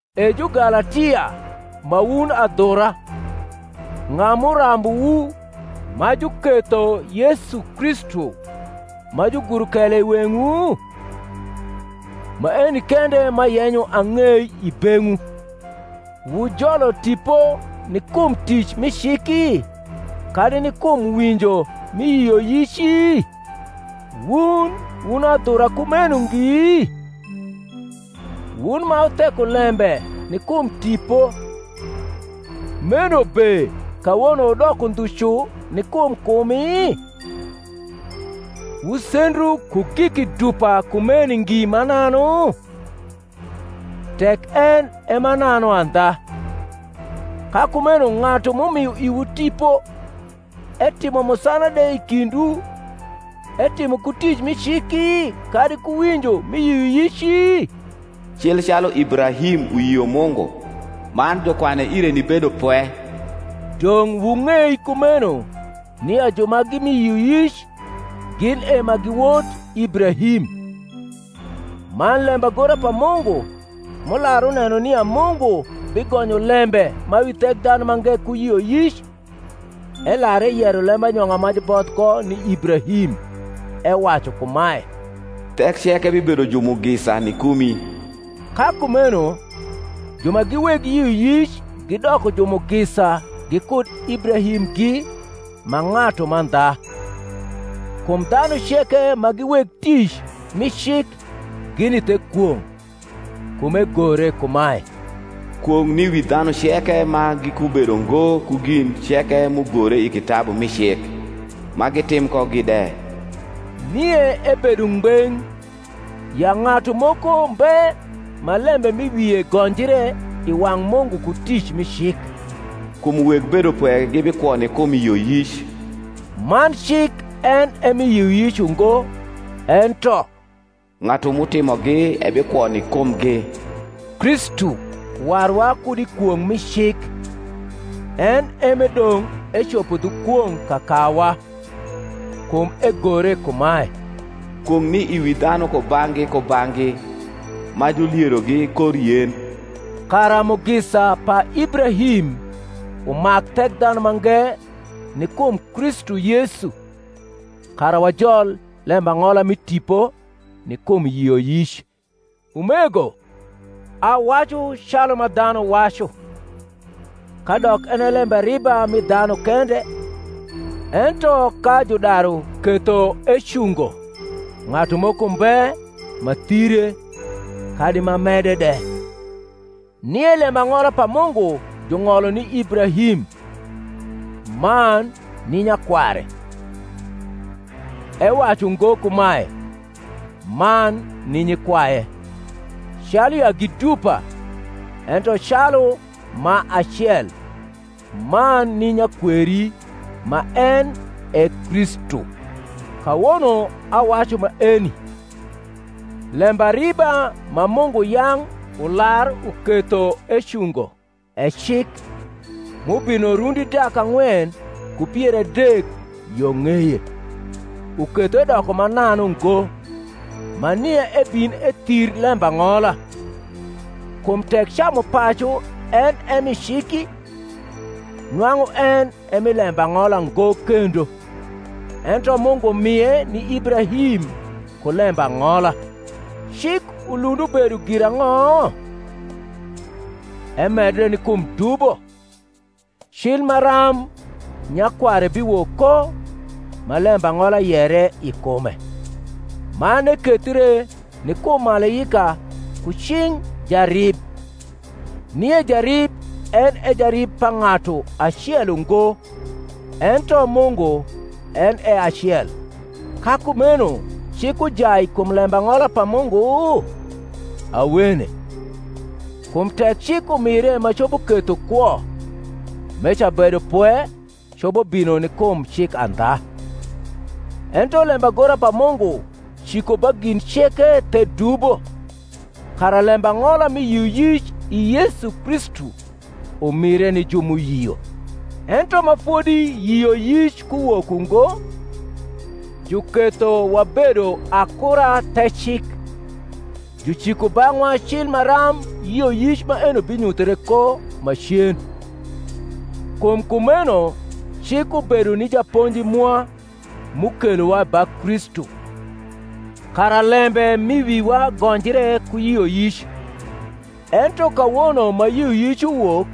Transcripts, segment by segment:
E Jugalatia ma wun adhura, ng’a m’urambuwu, ma juketho Yesu Kristu ma juguro kele i weng’wu? Maeni kende m’ayenyo ang’ei i beng’wu, Wujolo Tipo ni kum tic mi ciki kadi ni kum winjo mi yioyici? Wun wun adhura kumeno ngi? wun ma wutheko lembe ni kum Tipo, meno be kawono wudoko ndhu cu ni kum kumi? Wusendru ku giki dupa kumeni ngi mananu? tek en e mananu andha. Ka kumeno ng’atu m’umio iwu Tipo, etimo musana de i kindwu, etimo ku tic mi ciki, kadi ku winjo mi yioyici? Cil calu Ibrahim uyio Mungu, man jukwane ire ni bedopwe. Dong’ wung’ei kumeno nia ju ma gi mi yioyic, gin e ma gi wot Ibrahim. Man lembagora pa Mungu, m’ular uneno nia Mungu bigonyo lembe ma wi Thekdhanumange ku yioyic, elar eyero lembanyong’a ma juboth ko ni Ibrahim, ewacu kumae, Thek ceke bibedo jumugisa ni kumi. Ka kumeno ju ma gi weg yioyic gidoko jumugisa gikud Ibrahimgi ma ng’atu mandha. Kum dhanu ceke ma gi weg tic mi cik gini the kwong’: kum egore kumae, Kwong’ ni wi dhanu ceke ma gikubedo ngo ku gin ceke m’ugore i kitabu mi cik, ma gitim kogi de. Nie ebedo ngbeng’, ya ng’atu moko mbe ma lembe m’i wie gonjre i wang’ Mungu ku tic mi cik: kum weg bedopwe gibikwo ni kum yioyic; man cik en e mi yioyic ungo; ento, Ng’atu m’utimogi ebikwo ni kumgi. Kristu waruwa kud i kwong’ mi cik, en e m’edong’ ecopo dhu kwong’ kakawa; kum egore kumae, Kwong’ ni i wi dhanu kubang’gi kubang’gi ma julierogi kor yen: kara mugisa pa Ibrahim umak Thekdhanumange ni kum Kristu Yesu: kara wajol lembang’ola mi Tipo ni kum yioyic. Umego, awacu calu ma dhanu wacu: Kadok en e lembariba mi dhanu kende, ento ka judaru ketho ecungo, ng’atu moko mbe ma thire, kadi ma mede de. Nie lembang’ola pa Mungu jung’olo ni Ibrahim, man ni nyakware. Ewacu ngo kumae, Man ni nyikwaye, calu ya gi dupa; ento calu ma acel, Man ni nyakweri, ma en e Kristu. Kawono awacu maeni: Lembariba ma Mungu yang’ ular uketho ecungo, e cik, m’ubino rundi dak ang’wen ku pier adek yo ng’eye, uketho edoko mananu ngo, ma nia ebin ethir lembang’ola. Kum tek camupacu en e mi ciki, nwang’u en e mi lembang’ola ngo kendo: ento Mungu mie ni Ibrahim ku lembang’ola. Cik ulund ubedo girang’o? Emedre ni kum dubo, cil maram nyakware biwok ko ma lembang’ola yere i kume; man ekethre ni kum malaika ku cing’ jarib. Nie jarib en e jarib pa ng’atu acel ungo; ento Mungu en e acel. Ka kumeno cik ujai kum lembang’ola pa Mungu? Awene: kum tek cik umire ma copo ketho kwo, meca bedopwe copo bino ni kum cik andha. Ento lembagora pa Mungu ciko ba gin ceke the dubo, kara lembang’ola mi yioyic i Yesu Kristu umire ni ju m’uyio. Ento ma fodi yioyic kuwok ungo, juketho wabedo akura the cik, juciko bang’wa cil maram yioyic maeni binyuthre ko macen. Kum kumeno cik ubedo ni japonji mwa m’ukelowa ba Kristu, kara lembe m’i wiwa gonjre ku yioyic. Ento kawono ma yioyic uwok,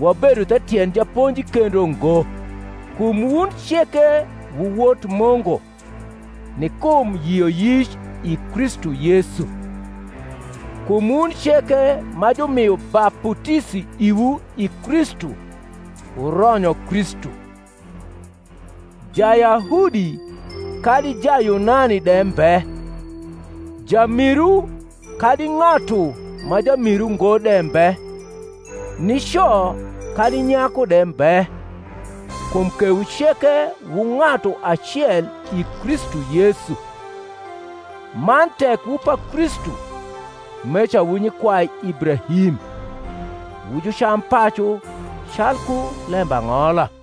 wabedo the tiend japonji kendo ngo. Kum wun ceke wu wot Mungu, ni kum yioyic, i Kristu Yesu. Kum wun ceke ma jumio baputisi iwu i Kristu wuronyo Kristu. Jayahudi kadi Jayunani de mbe, jamiru kadi ng’atu ma jamiru ngo de mbe, nico kadi nyaku de mbe; kum kewu ceke wu ng’atu acel i Kristu Yesu. Man tek wu pa Kristu, meca wu nyikwai Ibrahim, wu jucampacu calku lembang’ola.